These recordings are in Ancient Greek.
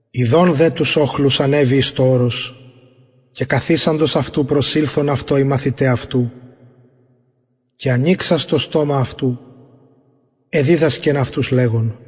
ιδων δε τους οχλους ανεβη εις το ορος και καθισαντος αυτου προσηλθον αυτω οι μαθηται αυτου και ανοιξας το στομα αυτου εδιδασκεν αυτους λεγων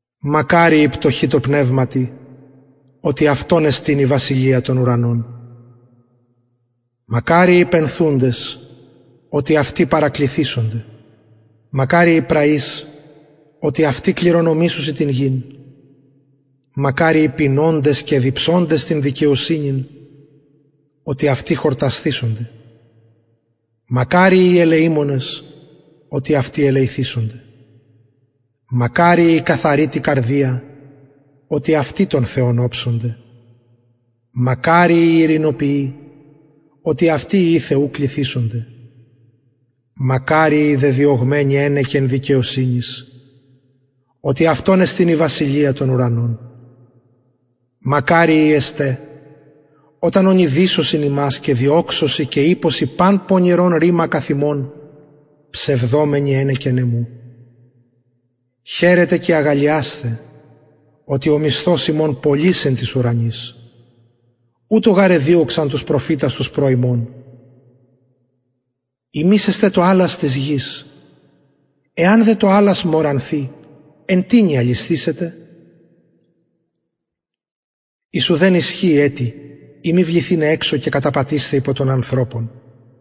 μακαριοι οι πτωχοι τω πνευματι οτι αυτων εστιν η βασιλεια των ουρανων μακαριοι οι πενθουντες οτι αυτοι παρακληθησονται μακαριοι οι πραεις οτι αυτοι κληρονομησουσιν την γην μακαριοι οι πεινωντες και διψωντες την δικαιοσυνην οτι αυτοι χορτασθησονται μακαριοι οι ελεημονες οτι αυτοι ελεηθησονται μακαριοι οι καθαροι τη καρδια οτι αυτοι τον θεον οψονται μακαριοι οι ειρηνοποιοι οτι αυτοι υιοι θεου κληθησονται μακαριοι οι δεδιωγμενοι ενεκεν δικαιοσυνης οτι αυτων εστιν η βασιλεια των ουρανων μακαριοι εστε οταν ονειδισωσιν υμας και διωξωσιν και ειπωσιν παν πονηρον ρημα καθ υμων ψευδομενοι ενεκεν εμου χαιρετε και αγαλλιασθε οτι ο μισθος υμων πολυς εν τοις ουρανοις ουτως γαρ εδιωξαν τους προφητας τους προ υμων υμεις εστε το αλας της γης εαν δε το αλας μωρανθη εν τινι αλισθησεται εις ουδεν ισχυει ετι ει μη βληθηναι εξω και καταπατεισθαι υπο των ανθρωπων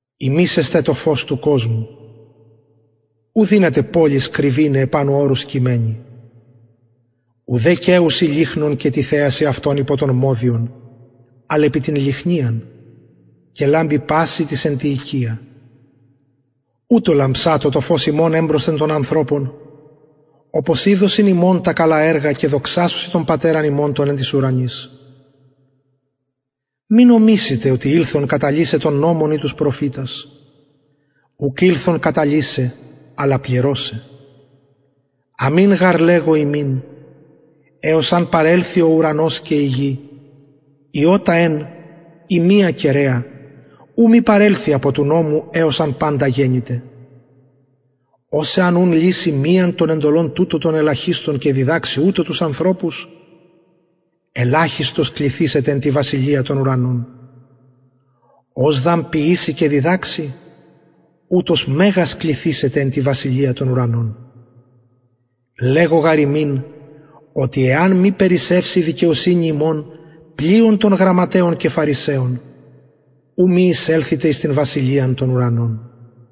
υμεις εστε το φως του κοσμου ου δυναται πολις κρυβηναι επανω ορους κειμενη ουδε καιουσιν λυχνον και τιθεασιν αυτον υπο τον μοδιον αλλ επι την λυχνιαν και λαμπει πασιν τοις εν τη οικια ουτως λαμψατω το φως υμων εμπροσθεν των ανθρωπων οπως ιδωσιν υμων τα καλα εργα και δοξασωσιν τον πατερα υμων τον εν τοις ουρανοις μη νομισητε οτι ηλθον καταλυσαι τον νομον η τους προφητας ουκ ηλθον καταλυσαι αλλα πληρωσαι αμην γαρ λεγω υμιν εως αν παρελθη ο ουρανος και η γη ιωτα εν η μια κεραια ου μη παρελθη απο του νομου εως αν παντα γενηται ος εαν ουν λυση μιαν των εντολων τουτων των ελαχιστων και διδαξη ουτως τους ανθρωπους ελαχιστος κληθησεται εν τη βασιλεια των ουρανων ος δ αν ποιηση και διδαξη ουτος μεγας κληθησεται εν τη βασιλεια των ουρανων λεγω γαρ υμιν οτι εαν μη περισσευση η δικαιοσυνη υμων πλειον των γραμματεων και φαρισαιων ου μη εισελθητε εις την βασιλειαν των ουρανων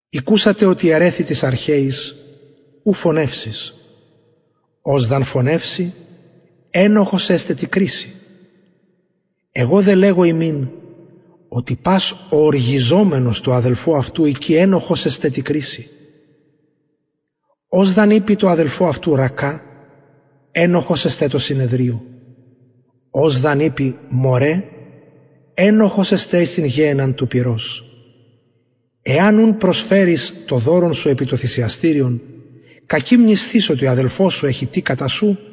ηκουσατε οτι ερρεθη τοις αρχαιοις ου φονευσεις ος δ αν φονευση ενοχος εσται τη κρισει εγω δε λεγω υμιν οτι πας ο οργιζομενος τω αδελφω αυτου εικη ενοχος εσται τη κρισει ος δ αν ειπη τω αδελφω αυτου ρακα ενοχος εσται τω συνεδριω ος δ αν ειπη μωρε ενοχος εσται εις την γεενναν του πυρος εαν ουν προσφερης το δωρον σου επι το θυσιαστηριον και εκει μνησθης οτι ο αδελφος σου εχει τι κατα σου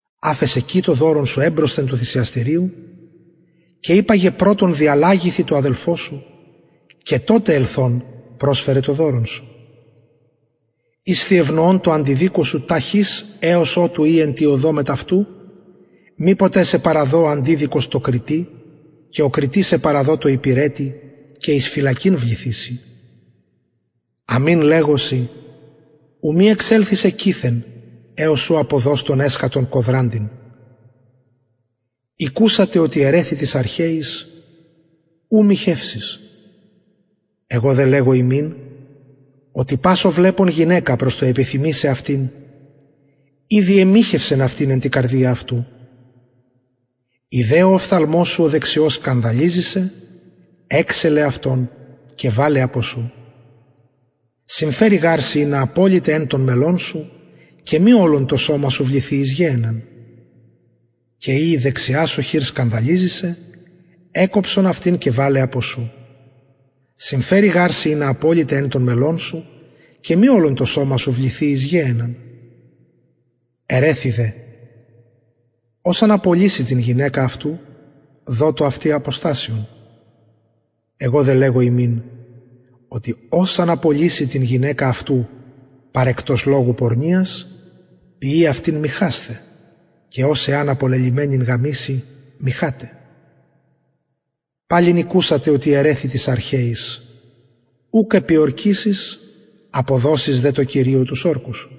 αφες εκει το δωρον σου εμπροσθεν του θυσιαστηριου και υπαγε πρωτον διαλλαγηθι τω αδελφω σου και τοτε ελθων προσφερε το δωρον σου ισθι ευνοων τω αντιδικω σου ταχυ εως οτου ει εν τη οδω μετ αυτου μηποτε σε παραδω ο αντιδικος τω κριτη και ο κριτης σε παραδω τω υπηρετη και εις φυλακην βληθηση αμην λεγω σοι ου μη εξελθης εκειθεν εως αν αποδως τον εσχατον κοδραντην ηκουσατε οτι ερρεθη ου μοιχευσεις εγω δε λεγω υμιν οτι πας ο βλεπων γυναικα προς το επιθυμησαι αυτην ηδη εμοιχευσεν αυτην εν τη καρδια αυτου ει δε ο οφθαλμος σου ο δεξιος σκανδαλιζει σε εξελε αυτον και βαλε απο σου συμφερει γαρ σοι ινα αποληται εν των μελων σου και μη ολον το σωμα σου βληθη εις γεενναν και ει η δεξια σου χειρ σκανδαλιζει σε εκκοψον αυτην και βαλε απο σου συμφερει γαρ σοι ινα αποληται εν των μελων σου και μη ολον το σωμα σου βληθη εις γεενναν ερρεθη δε οτι ος αν απολυση την γυναικα αυτου δοτω αυτη αποστασιον εγω δε λεγω υμιν οτι ος αν απολυση την γυναικα αυτου παρεκτος λογου πορνειας ποιει αυτην μοιχασθαι και ος εαν απολελυμενην γαμηση μοιχαται παλιν ηκουσατε οτι ερρεθη τοις αρχαιοις ουκ επιορκησεις αποδωσεις δε τω κυριω τους ορκους σου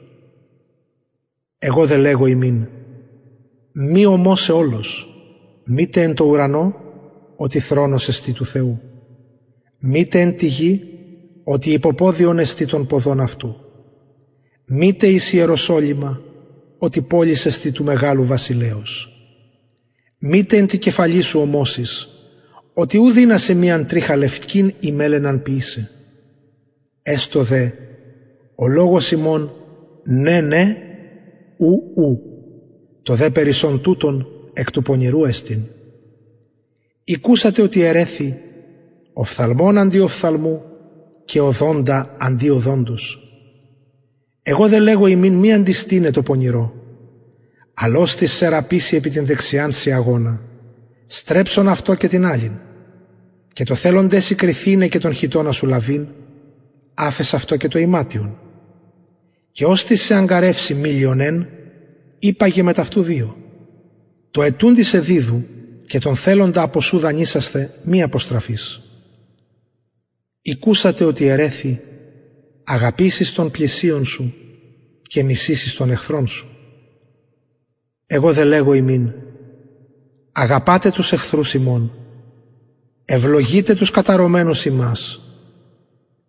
εγω δε λεγω υμιν μη ομοσαι ολως μητε εν τω ουρανω οτι θρονος εστιν του θεου μητε εν τη γη οτι υποποδιον εστιν των ποδων αυτου μητε εις ιεροσολυμα οτι πολις εστιν του μεγαλου βασιλεως μητε εν τη κεφαλη σου ομοσης οτι ου δυνασαι μιαν τριχα λευκην η μελαιναν ποιησαι εστω δε ο λογος υμων ναι ναι ου ου το δε περισσον τουτων εκ του πονηρου εστιν ηκουσατε οτι ερρεθη οφθαλμον αντι οφθαλμου και οδοντα αντι οδοντος εγω δε λεγω υμιν μη αντιστηναι τω πονηρω αλλ οστις σε ραπισει επι την δεξιαν σιαγονα στρεψον αυτω και την αλλην και τω θελοντι σοι κριθηναι και τον χιτωνα σου λαβειν αφες αυτω και το ιματιον και οστις σε αγγαρευσει μιλιον εν υπαγε μετ αυτου δυο τω αιτουντι σε διδου και τον θελοντα απο σου δανεισασθαι μη αποστραφης ηκουσατε οτι ερρεθη αγαπησεις τον πλησιον σου και μισησεις τον εχθρον σου εγω δε λεγω υμιν αγαπατε τους εχθρους υμων ευλογειτε τους καταρωμενους υμας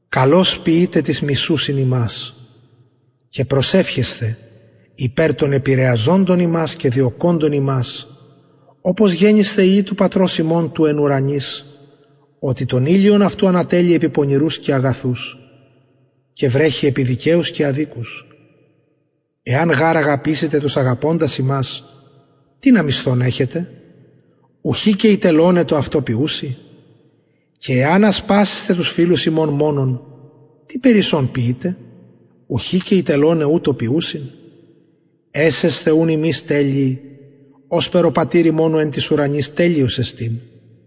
καλως ποιειτε τοις μισουσιν υμας και προσευχεσθε υπερ των επηρεαζοντων υμας και διωκοντων υμας οπως γενησθε υιοι του πατρος υμων του εν τοις ουρανοις οτι τον ηλιον αυτου ανατελλει επι πονηρους και αγαθους και βρεχει επι δικαιους και αδικους εαν γαρ αγαπησητε τους αγαπωντας υμας τινα μισθον εχετε ουχι και οι τελωναι το αυτο ποιουσιν και εαν ασπασησθε τους φιλους υμων μονον τι περισσον ποιειτε ουχι και οι τελωναι ουτως ποιουσιν εσεσθε ουν υμεις τελειοι ωσπερ ο πατηρ υμων ο εν τοις ουρανοις τελειος εστιν